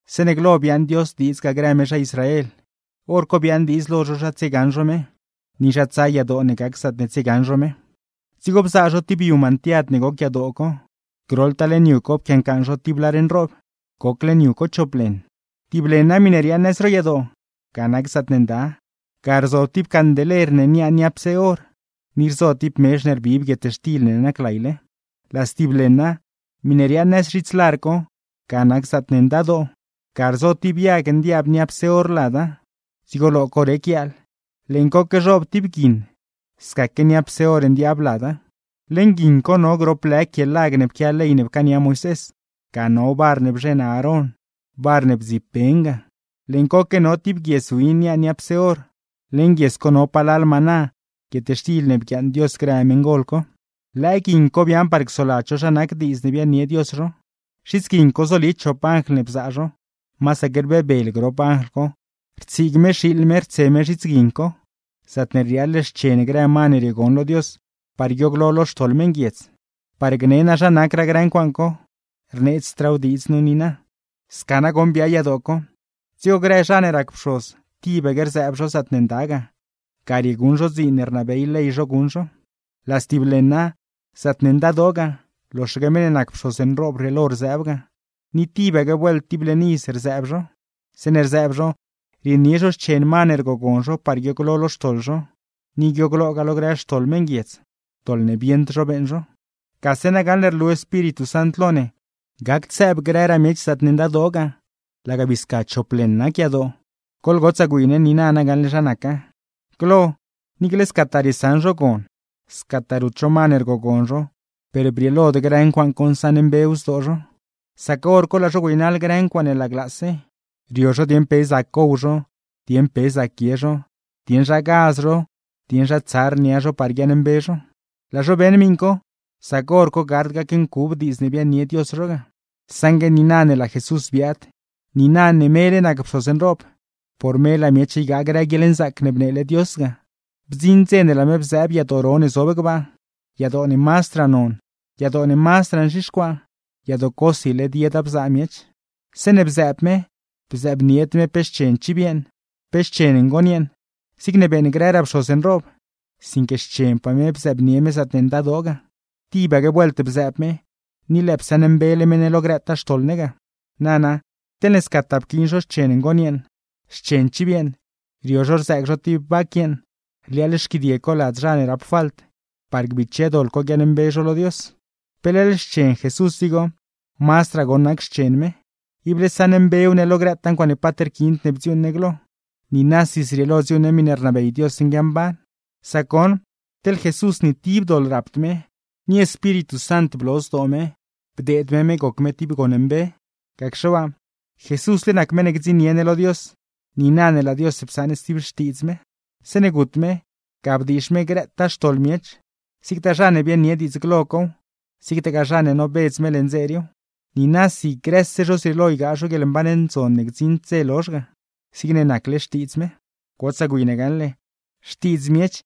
Zeeṉe glo biaaṉ Dios diidz ga grë me zha Israel, hor co biaaṉ diidz lo zho zha tsiegaṉ zho me, ni zha tsaa yadoo ne gac zaatne tsiegaṉ zho me. Dzigo bzaa zho tib yu mantiad ne goc yadoo co, groḻtaa leṉ yu co pquiaancaaṉ zho tib lar nroob, goc leṉ yu co chop leṉ. Tib leṉa, miṉe riaaṉ nëz ro yadoo, ga nac zaatne Nda, ga rzo tib candeler ne niaa niapse or, ni rzo tib mezh ne rbib guietxtil ne naclayle. Laa stib leṉa, miṉe riaaṉ nëz zhits lar co, ga nac zaatne Ndadoo; ga rzo tib yag ndiaab niapse or lada, dzigo lo co rec yaal; leeṉ coque zhoob tib guiṉ scaque niapse or ndiaab lada. Leṉ guiṉ co no grop lë quie lag ne pquia ley ne pcaania Moisés, ga no bar ne bzheṉ Aarón, bar ne bdzib ben ga; leeṉ coque no tib guies win niaa niapse or, leṉ guies co no palal maná, guietxtil ne bguiaaṉ Dios grë meṉgol co. Lëë guiṉ co biaaṉ par csoladz zho zha nac diidz ne biaaṉnie Dios zho. Zhits guiṉ co zoli chop anjl ne bzaa zho, masaque rbebel grop anjl co rtsiig me xiiḻ me rtse me zhits guiṉ co, zaatne rliaaḻ xchen grë ma ne riogon lo Dios, par guiooglo lo xtoḻ meṉguiedz. Par gne naa zha nacraa grë ncuaaṉ co, rneedzraaw diidz nu niina. Sca nagoṉ biaa yadoo co, dzigo grë zha ne rac pxoz tibaque rzëëb zho zaatne Nda ga; ga rieguṉ zho dziin ne rnabey ley zho guṉ zho. Laa stib leṉa, zaatne Ndadoo ga, loxaque meṉ ne nacse pxoz nroob rrieelo rzëëb ga, ni tibaque vuelt tib leṉ iz rzëëb zho. Zeeṉe rzëëb zho, rienie zho xchen ma ne rgogon zho par guiooglo lo xtoḻ zho, ni guiogloogaa lo grë xtoḻ meṉguiedz, doḻ ne bieṉd zho beeṉ zho. Gase na gaṉle rlu Espíritu Sant lo ne, gacd sëëb grëraa miech zaatne Ndadoo ga, laga bii sca chop leṉ nac yadoo. Goḻgotsaa gwi ne niina na gaṉle zha naca: Glo, niicle ne scataa riesaṉ zho gon, scataa rut zho ma ne rgogon zho, per brieelod grë ncuaaṉ co nsaṉmbew zdoo zho; sac hor co, laa zho güeynaḻ grë ncuaaṉe laglaase, rio zho dieṉ pe zac gow zho, dieṉ pe zac guie zho, dieṉ zha gaz zho, dieṉ zha tsar nia zho par guiaaṉmbe zho. Laa zho beeṉ miṉ co, sac hor co gard gacncub diidz ne biaaṉnie Dios zho ga. Saṉgue niina ne laa Jesús biaad, niina ne mele nac pxoz nroob, por me laa miech ygaa grë guieḻnzaac ne bneele Dios ga. Bdziṉ dze laa me bzëëb yadoo ro ne zob gbaa (yadoo ne mazdraa non, yadoo ne mazdraa nzhixcuaa, yadoo cosi led yeda bzaa miech), zeeṉe bzëëb me, bzëëbnied me pe xchen chiv yeeṉ, pe xchen ngon yeeṉ, zigne beeṉ grëraa pxoz nroob; sinque xchenpaa me bzëëbnie me zaatne Ndadoo ga; tibaque vuelt bzëëb me, ni lëë psaṉmbele me ne lo grëtaa xtoḻ ne ga. Nana, teḻne scataa pquiin zho xchen ngon yeeṉ, xchen chiv yeeṉ, rio zho rzëëg zho tib vac yeeṉ rliaaḻ xquidie co lad zha ne rap falt, par gbiche doḻ co guiaaṉmbe zho lo Dios. ¿Pe leḻ xchen Jesús dzigo? Mazdraa goṉ nac xchen me, ible saṉmbew ne lo grëtaa ncuaaṉe paat rquiind ne bdziuuṉ ne glo, niinasi zrieelo dziuuṉ ne miṉe rnabey Dios nguiamban. Sac goṉ, teḻ Jesús ni tib doḻ rapd me, ni Espíritu Sant bloo zdoo me bdeed me me goc me tib gon mbe. Gacxe waa, Jesúsle nac meṉ ne gdziṉnie ne lo Dios, niina ne laa Dios psaṉ stib xtiidz me. Zeeṉe gut me, ga bdiizh me grëtaa xtoḻ miech, zigtaa zha ne biaaṉnie diidz glo cow, zigtagaa zha ne nobedz me leṉ dze riiw; niinasi grëse zho zrieelo ygaa zho guieḻmban ne gdziṉd dze lozh ga, zigne nacle xtiidz me. Gotsaa gwi ne gaṉle, xtiidz miech,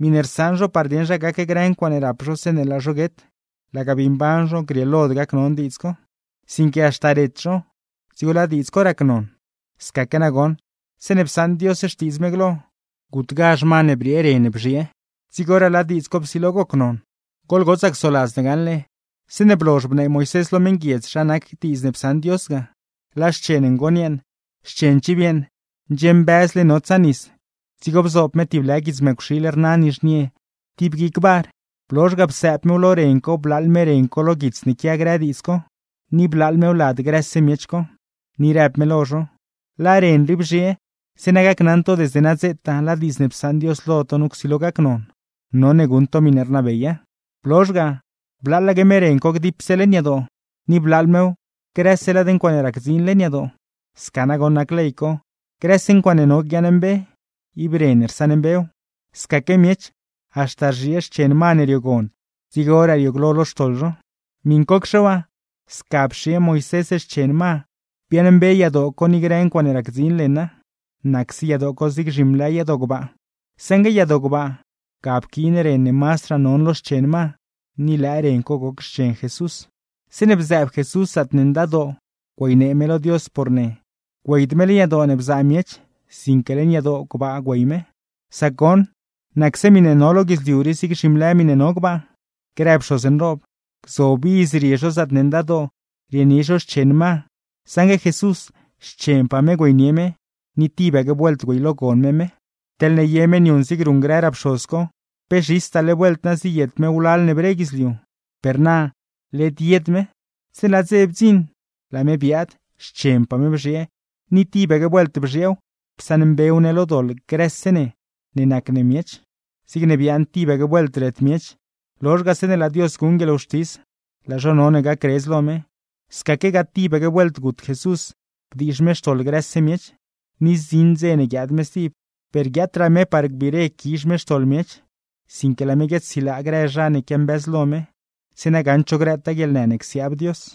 miṉe rsaṉ zho par dieṉ zha gac grë ncuaaṉe rap zho zeeṉe laa zho guet, laga bii mban zho grieelod gacnon diidz co; sinque haxta ret zho, dzigo laa diidz co racnon. Scaque nagoṉ, zeeṉe psaṉ Dios xtiidz me glo, gutgazh ma ne briee ren bzhiee dzigoraa laa diidz co psilo gocnon. Goḻgotsaa csoladz gaṉle, zeeṉe blozh bnee Moisés lo meṉguiedz zha nac diidz ne psaṉ Dios ga, laa xchen ngon yeeṉ, xchen chiv yeeṉ ndxiembëzle notsa nis; dzigo bzoob me tib lë guits mëcwxiil rna nizhnie tib guic bar, blozh ga, psëëb mew lo ren co blaaḻ me ren co lo guits ne quia grë diidz co, ni blaaḻ mew lad grëse miech co, ni rëb me lo zho: “Laa ren rii bzhiee, zeeṉa gacnaṉ to desde nadzetaa laa diidz ne psaṉ Dios lo to nu csilo gacnon, none guṉ to miṉe rnabeya.” Blozh ga, blaaḻaque me ren co gdipse leṉ yadoo, ni blaaḻ mew grëse lad ncuaaṉe racdziin leṉ yadoo. Sca nagoṉ nac ley co, grëse ncuaaṉe no guiaaṉmbe, ib ren rsaṉmbew; scaque miech, haxta rzhiee xchen ma ne riogon dzigoraa riooglo lo xtoḻ zho. Miṉcocxe waa, sca pxiee Moisés xchen ma biaaṉmbe yadoo co ni grë ncuaaṉe racdziin leṉa (nacse yadoo co zig zhimlë yadoo gbaa); saṉgue yadoo gbaa, ga pquiin ren ne mazdraa non lo xchen ma, ni lëë ren co goc xchen Jesús. Zeeṉe bzëëb Jesús zaatne Ndadoo güeynee me lo Dios por ne, güeyd me leṉ yadoo ne bzaa miech, sinque leṉ yadoo gbaa güey me; sac goṉ, nacse miṉe no lo guidzliu rii zig zhimlë miṉe no gbaa. Grë pxoz nroob, gzob iz rie zho zaatne Ndadoo rienie zho xchen ma; saṉgue Jesús, xchenpaa me güeynie me, ni tibaque vuelt güeylogon me me. Teḻne ye me niuṉ zig ruṉ grëraa pxoz co, pe zhistaale vuelt na ziyet me wlal ne bre guidzliu, ¡per na, led yed me! Zeeṉe laa dze bdziṉ, laa me biaad, xchenpaa me bzhiee, ni tibaque vuelt bzhieew psaṉmbew ne lo doḻ grëse ne ne nac ne miech. Zigne biaaṉ tibaque vuelt ret miech, lozh ga zeeṉe laa Dios guṉ guieḻwxtis, laa zho none gacredz lo me; scaquegaa tibaque vuelt gut Jesús bdiizh me xtoḻ grëse miech; ni zdziṉ ne guiaad me stib, per guiaatraa me par biire quizh me xtoḻ miech, sinque laa me guiaadsilaa grë zha ne quiambëzlo me, zeeṉa gaṉd zho grëtaa guieḻnë ne csiaab Dios.